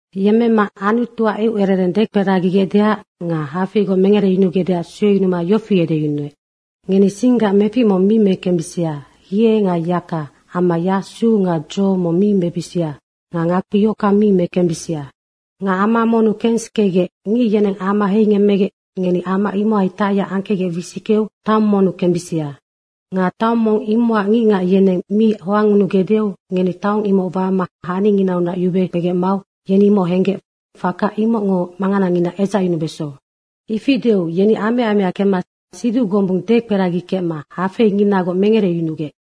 Yemmema Anutuac eucerereng dekperagigecdeac nga hafeigoc mengereyunugecdeac sueyunuma yofi edeyunuec, “Ngeni singgac mefic mong mi mekembisia, hie nga yaka amma yasu nga dzo mong mi mebisia nga ngakpi yohockang mi mekembisia. Nga ama monnu kensikegec, ngic yeneng ama heingemmegec ngeni ama imohai tacyac angkecgec wisickeu taong monnu kembisia. Nga taong mong imocac ngicngac yeneng mi hoangngunugecdeu ngeni taong imoc wama haninginaunac yube kpegec mau yeni imoc henggec faka imocngo manganangina edzacyunubeso.” Ifi deu yeni amea amea kemma siduc gombung dekperagikecma hafeinginagoc mengereyunugec.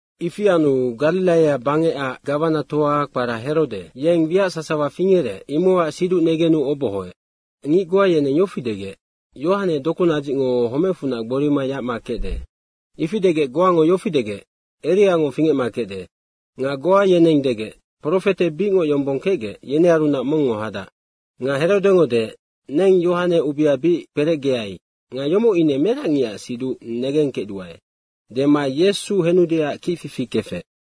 Ifi anu Gariraia bangecac gawanatoa kpara Herode, yeng wiac sasawa fingerec, imocac siduc negenu obohoec. Nocac ngic goa yeneng yofi degec, “Yohane dokunadzicngo homecfunac gborima yacma kecde.” Ifi degec goango yofi degec, “Eriango fingecma kecde.” nga goa yeneng degec, “Profete bicngoc yombong kecgec, yenearunac mongngo hadac.” Nga Herodengo deec, “Neng Yohane ubea bic kperecgeai nga yomoc ine merac ngicac siduc negengkecduae.” Dema Yesu henudeac kicfifi kefec.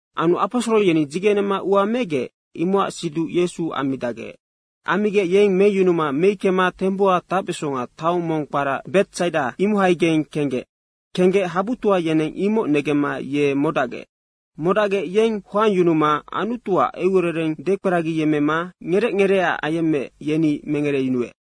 Anu aposoro yeni dzigenema ua megec, imocac siduc Yesu ammidacgec. Ammigec yeng meyunuma meickema tembuha tacbesonga taong mong kpara Betsaida, imohaigeng kenggec. Kenggec habutoa yeneng imoc negemma ye modacgec. Modacgec, yeng hoangyunuma Anutuac eucerereng dekperagiyemmema ngerec ngereeac ayemmeec, yeni mengereyunuec.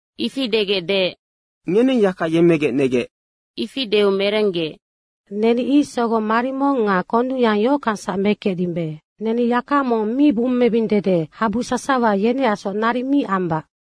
Ifi degec deec, “Ngeneng yaka yemmegec negec.” Ifi deu merenggec, “Neni ic sogong marimong nga kondungyang yohockangsac mekecdimbe. Neni yaka mong mi bummebing dede habu sasawa yeneacsoc naric mi ambac.”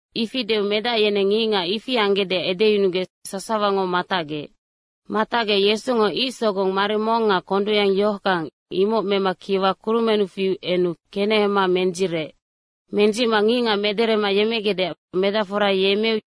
Ifi deu medac yeneng ngicngac ifi anggecdeac edeyunugec sasawango matacgec. Matacgec Yesungo ic sogong marimong nga kondungyang yohockang, imoc mema kiwa kurumennu fiu enu kenehema mendzirec. Mendzicma ngicngac mederema yemmegecdeac medacfora yemmeu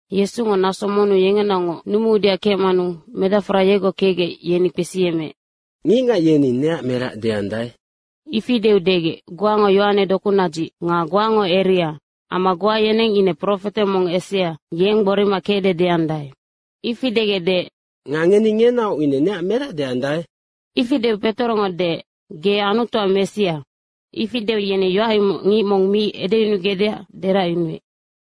Yesungo naso monnu yengenaocngoc numuudeac kecmanu medacfora yegoc kecgec yeni kpesiyemmeec, “Ngicngac yeni neac merac deandae?” Ifi deu degec, “Goango Yohane dokunadzic nga goango Eria amma goa yeneng ine profete mong esea, yeng gborima kecde deandae.” Ifi degec deec, “Nga ngeni ngenaoc ine neac merac deandae?” Ifi deu Petorongo deec, “Ge Anutuac Messia.” Ifi deu, yeni yoac imoc ngic mong mi edeyunugecdeac deracyunuec.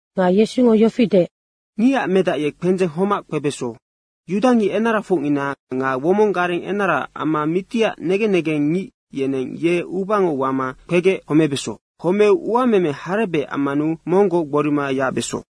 Nga Yesungo yofi deec, “Ngicac Medac ye kpendzeng homac kpebeso. Yudangic enarafocngina nga womong gareng enara amma mitiac negen negengngic yeneng ye ubango wama kpegec homebeso. Homeu uameme harebec ammanu monggoc gborima yacbeso.”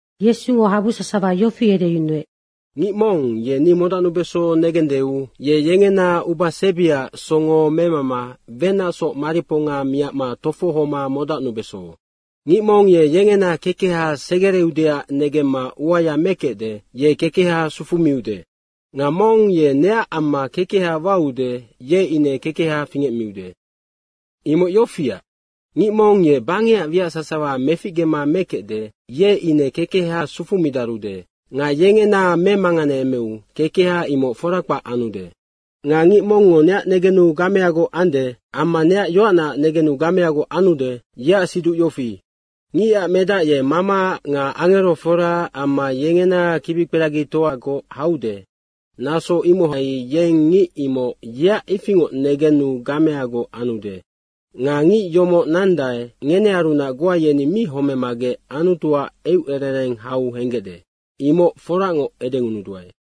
Yesungo habu sasawa yofi edeyunuec, “Ngic mong ye ni modacnubeso negendeu ye yengena ubasebiaac songo memama wenacsoc mariponga miacma tofohoma modacnubeso. Ngic mong ye yengena kekeha segereudeac negemma uaya mekecde, ye kekeha sufumiude. Nga mong ye neac amma kekeha waude, ye ine kekeha fingecmiude. Imoc yofiac, ngic mong ye bangecac wiac sasawa meficgema mekecde, ye ine kekeha sufumidarude nga yengena memanganeemeu kekeha imoc fora kpac anude. Nga ngic mongngo neac negenu gameagoc ande amma neac yoacnaac negenu gameagoc anude, yeac siduc yofi, Ngicac Medac ye Mamaac nga angeroforaac amma yengena kibikperagitoagoc haude, naso imohai yeng ngic imoc yeac ifingoc negenu gameagoc anude. Nga ngic yomoc nandae, ngenearunac goa yeni mi homemagec Anutuac eucerereng hau henggecde, imoc forangoc edengunuduae.”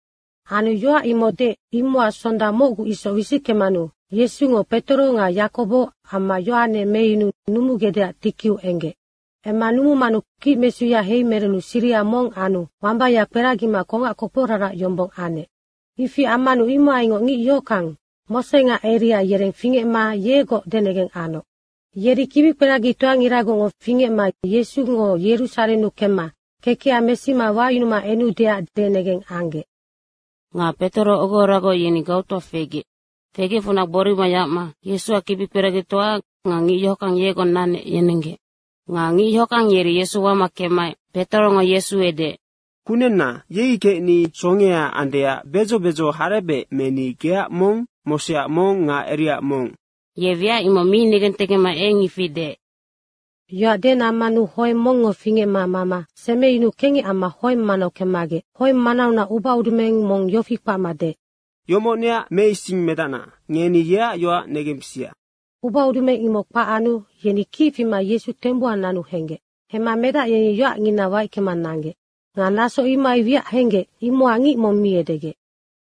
Anu yoac imoc deec, imocac sonda mocgu isoc wisickemanu Yesungo Petoro nga Yakobo amma Yohane meyunuu numugecdeac tikiu enggec. Emma numumanu kicmesuya heimerenu siriha mong anu wambaya kperagima kongac koporarac yombong anec. Ifi ammanu imohaingoc ngic yohockang, Mose nga Eria yereng fingecma yegoc denegeng anoc. Yeri kibikperagitoangiragocngo fingecma Yesungo Yerusarennu kemma kekeha mesima wayunuma enudeac denegeng anggec. Nga Petoro ogohoragoc, yeni gautoa fegec. Fegecfunac gborima yacma Yesuac kibikperagitoa nga ngic yohockang yegoc nanec yenenggec. Nga ngic yohockang yeri Yesu wama kemmaec Petorongo Yesu edeec, “Kunenna, yei kecni songea andeac bedzo bedzo harebec meni, geac mong, Moseac mong nga Eriaac mong.” Ye wiac imoc mi negentegecma eng ifi deec. Yoac denammanu hoeng mongngo fingecma mama semeyunuu kengec amma hoeng manau kemmagec hoeng manaunac ubaudumeng mong yofi kpacma deec, “Yomoc neac Meisingmedacna, ngeni yeac yoac negembisia.” Ubaudumeng imoc kpac anu yeni kic fima Yesu tembuha nanu henggec. Hemma medac yeni yoacngina waickema nanggec. Nga naso imohai wiac henggec, imocac ngic mong mi edegec.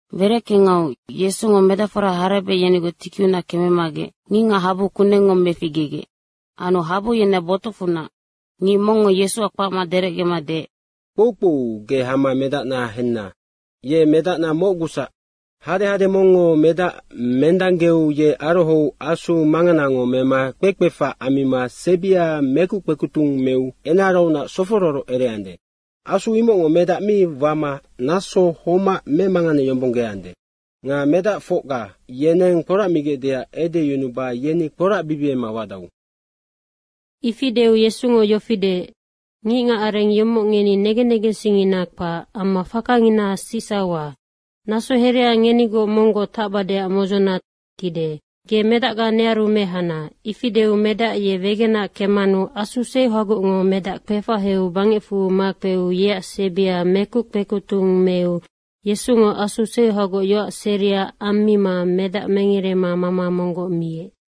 Wereckengau Yesungo medacfora harebec yenigoc tikiunac kememagec ngicngac habu kunengngo meficgegec. Anu habu yeneac botucfunac ngic mongngo Yesuac kpacma derecgema deec, “Kpoukpou, ge hama medacna henna, ye medacna mocgusac. Hadehade mongngo medac mendanggeu ye arohou asu manganango mema kpekpefac ammima sebia mekuc kpekutung meu enaraunac sofororoc ereande. Asu imocngo medac mi wama naso homac memanganeyombonggeande. Nga medacfocga yeneng kporacmigecdeac edeyunuba yeni kporacbibiema wadau.” Ifi deu Yesungo yofi deec, “Ngicngac areng yomoc ngeni negen negensingngina kpac amma fakangina sicsauha. Naso herea ngenigoc monggoc tacbadeac modzona tide. Ge medacga nearu mehana.” Ifi deu medac ye wegena kemmanu asu seuhagocngo medac kpefaheu bangecfu makpeu yeac sebia mekuc kpekutung meu Yesungo asu seuhagoc yoac seria ammima medac mengerema mama monggoc miec.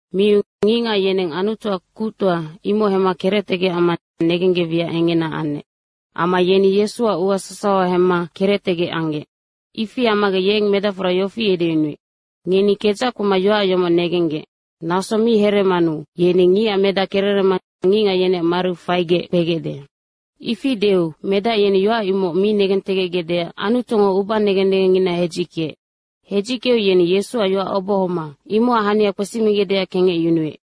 Miu ngicngac yeneng Anutuac kuctoa imoc hemma kerectegec amma negenggec wiac engena anec. Amma yeni Yesuac ua sasawa hemma kerectegec anggec. Ifi ammagec yeng medacfora yofi edeyunuec, “Ngeni kedzac kpema yoac yomoc negenggec. Naso mi hereemanu yeni Ngicac Medac kererema ngicngac yeneac mariu faigec kpegecde.” Ifi deu medac yeni yoac imoc mi negentegecgecdeac Anutungo uba negen negengngina hedzickeec. Hedzickeu yeni Yesuac yoac obohoma imocac hania kpesimigecdeac kengecyunuec.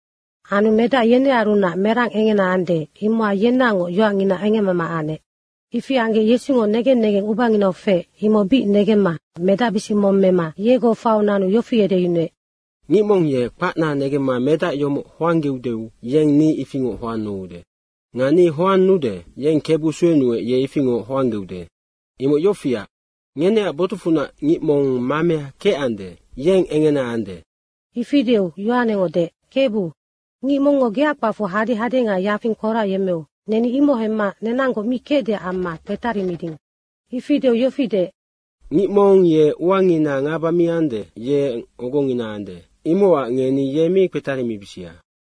Anu medac yenearunac merang engena ande, imocac yenaocngoc yoacngina engemmama anec. Ifi anggec Yesungo negen negeng ubanginau feec, imoc bic negemma medacbisic mong mema yegoc faiu nanu yofi edeyunuec, “Ngic mong ye kpacna negemma medac yomoc hoanggeude, yeng ni ifingoc hoannude. Nga ni hoannude, yeng Kebu suenuec, ye ifingoc hoanggeude. Imoc yofiac, ngeneac botucfunac ngic mong mamea kecande, yeng engena ande.” Ifi deu Yohanengo deec, “Kebu, ngic mongngo geac kpacfu hadehade nga yafing kporacyemmeu neni imoc hemma nenanggoc mi kecdeac amma kpetarimiding.” Ifi deu yofi deec, “Ngic mong ye uanginaac ngaba mi ande, yeng ogongina ande. Imocac ngeni ye mi kpetarimibisia.”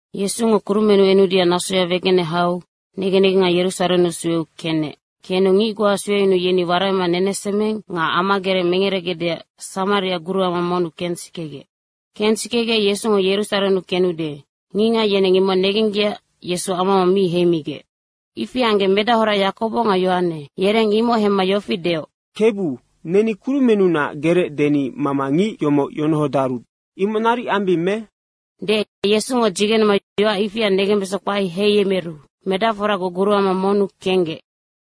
Yesungo kurumennu enudeac nasoya wegene hau negen negenga Yerusarennu sueu kenec. Kenu ngic goa sueyunuu yeni waraima nenesemeng nga amagerec mengeregecdeac Samariaac guruama monnu kensikegec. Kensikegec Yesungo Yerusarennu kenude, ngicngac yeneng imoc negenggecac Yesu ama mong mi heimigec. Ifi anggec medahora Yakobo nga Yohane yereng imoc hemma yofi deoc, “Kebu, neni kurumennunac gerec deni mama ngic yomoc yonohodaru, imoc naric ambing me?” Deec Yesungo dzigenema yoac ifia negembesonga kpae heiyemeru medacforagoc guruama monnu kenggec.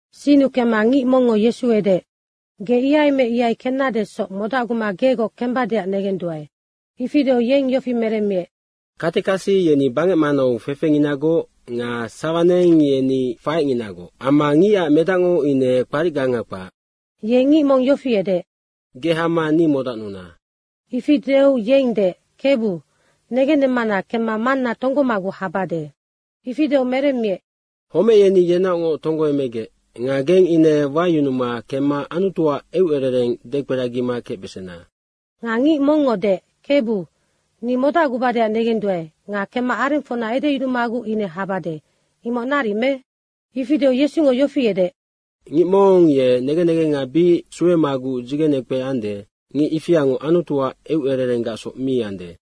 Sinnu kemma ngic mongngo Yesu edeec, “Ge ihai me ihai kennadesoc modacguma gegoc kembadeac negenduae.” Ifi deu yeng yofi meremmiec, “Katekasi yeni bangec manau fefenginagoc nga sawa neng yeni faecnginagoc amma Ngicac Medacngo ine kparicganga kpac.” Ye ngic mong yofi edeec, “Ge hama ni modacnuna.” Ifi deu yeng deec, “Kebu, negennemmana kemma manna tonggomaguc habade.” Ifi deu meremmiec, “Homec yeni yenaocngoc tonggoemegec nga geng ine wayunuma kemma Anutuac eucerereng dekperagima kecbesena.” Nga ngic mongngo deec, “Kebu, ni modacgubadeac negenduae nga kemma arengfocna edeyunumaguc ine habade, imoc naric me?” Ifi deu Yesungo yofi edeec, “Ngic mong ye negen negenga bic suemaguc dzigenekpe ande, ngic ifiango Anutuac eucererenggacsoc mi ande.”